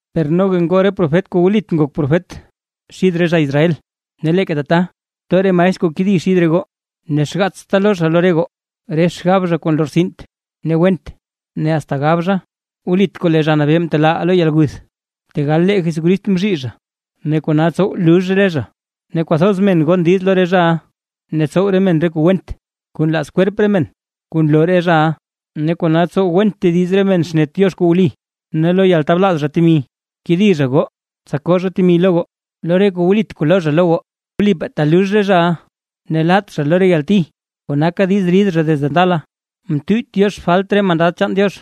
Per noga ngoo re profet kuu wlit ngok profet xid re zha Israel; ne leeka tata too re maestr kuu kedi xid re goo. Ne xgaatsta loo zha lo re goo, re xgab zha kuu nlortsint ne went ne asta gab zha: “Wlit kuu lee Zha Nabee mtelaaʼaa lo yalguth”, tegal lee Jesús mzhii zha, ne kona tsow lux re zha. Ne kwathoz men gon diiz lo re zhaʼa ne tsow re men re kuu went kuu nlaaz kwerp re men, kuu nloo re zhaʼa; ne kona tsow went tediz re men xnet Diox kuu wli. Ne lo yaltablaaz zha temi, kedi zha goo tsa koo zha temi lo goo lo re kuu wlit kuu loo zha lo goo. Per wlipaa talux re zhaʼa ne laat zha lo re yalti kuu naka diiz rid zha desde ndala. Mtuyyt Diox re falt chaan re mandad chaan Diox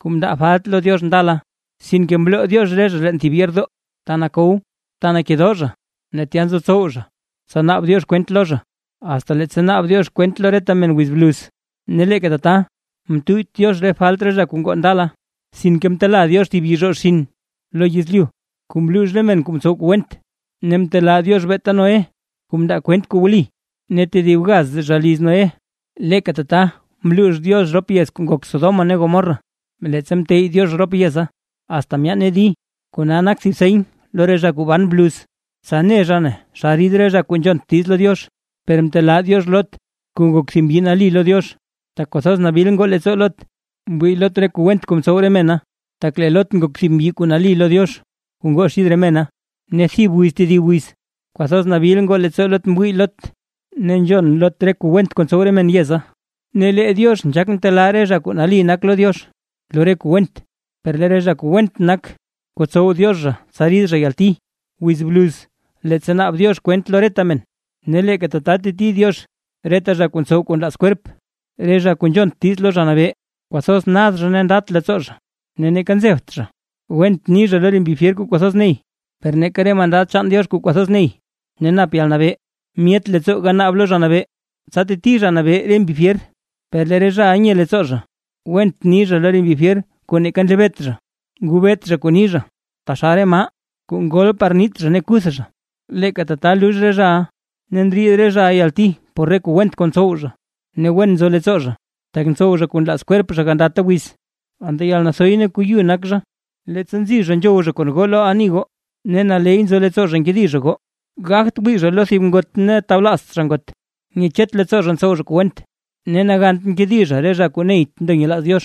kuu mndaa falt lo Diox ndala, sinke mloo Diox re zha leen thib yeerdoo, ta nakow, ta ndekedoo zha ne tya nzotsow zha, tsa naab Diox kwent lo zha, asta leettsa naab Diox kwent lo reta men wiz bluz. Ne leeka tata mtuyyt Diox re falt re zha kuu ngoo ndala, sinke mtela Diox thib yizhoo xinn lo yezlyu kuu mluux re men kuu mtsow kuu went; ne mtelaa Diox beeta Noé kuu mndaa kwent kuu wli, ne tedib gaz zha liz Noé. Leeka tata mluux Diox rop yez kuu ngok Sodoma ne Gomorra, leettsa mteyy Diox rop yeza asta myaane di, kona nak thib seny lo re zha kuu ban bluz, tsa ne zha naa xa rid re zha kuu nzhont diiz lo Diox. Per mtelaa Diox Lot, kuu ngok thib mbyi nali lo Diox, tak kwathoz nabil ngoo leettsoo Lot mwii Lot re kuu went kuu mtsow re mena. Tak lee Lot ngok thib mbyi kuu nali lo Diox, kuu ngoo xid re mena, ne thib wiz tedib wiz, kwathoz nabil ngoo leettsoo Lot mwii Lot ne nzhon Lot re kuu went kuu ntsow re men yeza. Ne lee Diox nzhaak ntelaa re zha kuu nali nak lo Diox lo re kuu went, per lee re zha kuu went nak, kotsow Diox zha tsa rid zha yalti, wiz bluz leettsa naab Diox kwent lo reta men. Ne leeka tata teti Diox reta zha kuu ntsow kuu nlaaz kwerp, re zha kuu nzhont diiz lo Zha Nabee. Kwathoz nad zha ne ndat leettsoo zha; ne neeka nzebt zha went ni zha lo re mbi fyer kuu kwathoz ney, per neeka re mandad chaan Diox kuu kwathoz ney ne nap yalnabee, myet leettsoo ganaab lo Zha Nabee, tsa teti Zha Nabee re mbi fyer. Per lee re zhaʼa nye leettsoo zha, went ni zha lo re mbi fyer kuu neeka nlebeet zha. Ngobeet zha kuu ni zha taxal re maa kuu ngol par niit zha ne kuth zha, leeka tata lux re zhaʼa, ne ndriid re zha yalti por re kuu went kuu ntsow zha. Ne wen nzo leettsoo zha, tak ntsow zha kuu nlaaz kwerp zha gandata wiz; anta yalnathoy ne kuu yu nak zha, leettsa nzi zha nzhow zha kon goo lo ani goo, ne naley nzo leettsoo zha nkedi zha goo. Gagt wii zha lo thib ngot ne tablaazt zha ngot; nyechet leettsoo zha ntsow zha kuu went. Ne nagant nkedi zha re zha kuu neyt ndo nyelaaz Diox;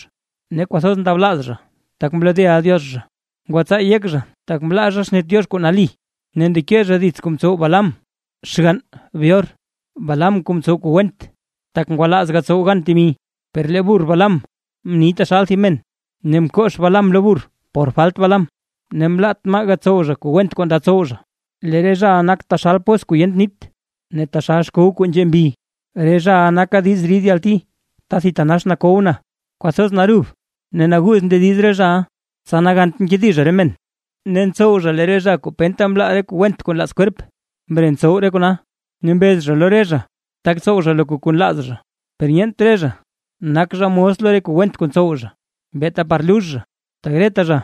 ne kwathoz ndablaaz zha tak mlodeʼa Diox zha. Ngwatsaa yek zha tak mlaa zha xnet Diox kuu nali, ne ndeke zha dits kuu mtsow Balaam xgann Beor, Balaam kuu mtsow kuu went, tak ngwalaaz Balaam gatsow gan temi, per lee burr Balaam mni taxal thib men, ne mkox Balaam lo burr por falt Balaam, ne mlaat maa gatsow zha kuu went kuu nda tsow zha. Lee re zhaʼa nak taxal pos kuu yent nit, ne taxal xkow kuu nzhe mbi; re zhaʼa naka diiz rid yalti ta thitanax nakow na. Kwathoz narub ne naguuz ndediz re zhaʼa, tsa nagant nkedi zha re men ne ntsow zha lee re zha kuu penta mlaa re kuu went kuu nlaaz kwerp, mre ntsow re kona, ne mbez zha lo re zha, tak tsow zha loka kuu nlaaz zha, per nyeent re zha nak zha mos lo re kuu went kuu ntsow zha, beeta par lux zha; tak reta zha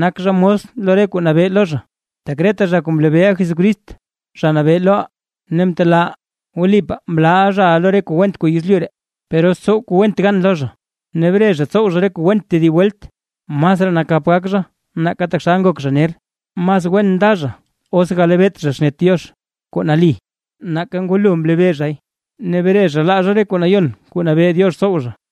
nak zha mos lo re kuu nabee lo zha. Tak reta zha kuu mlebeeʼa Jesucrist Zha Nabee loʼaa ne mtelaaʼaa, wlipaa mlaaʼa zhaʼa lo re kuu went kuu yezlyu ree, per os tsow kuu went gan lo zha ne bre zha ntsow zha re kuu went tedib welt, masraa nakap gak zha nake taxal ngok zha ner. Mas wen nda zha, os galebeet zha xnet Diox kuu nali, nake ngwalo mlebee zhay, ne bre zha laa zha re kuu nayon kuu nabee Diox tsow zha.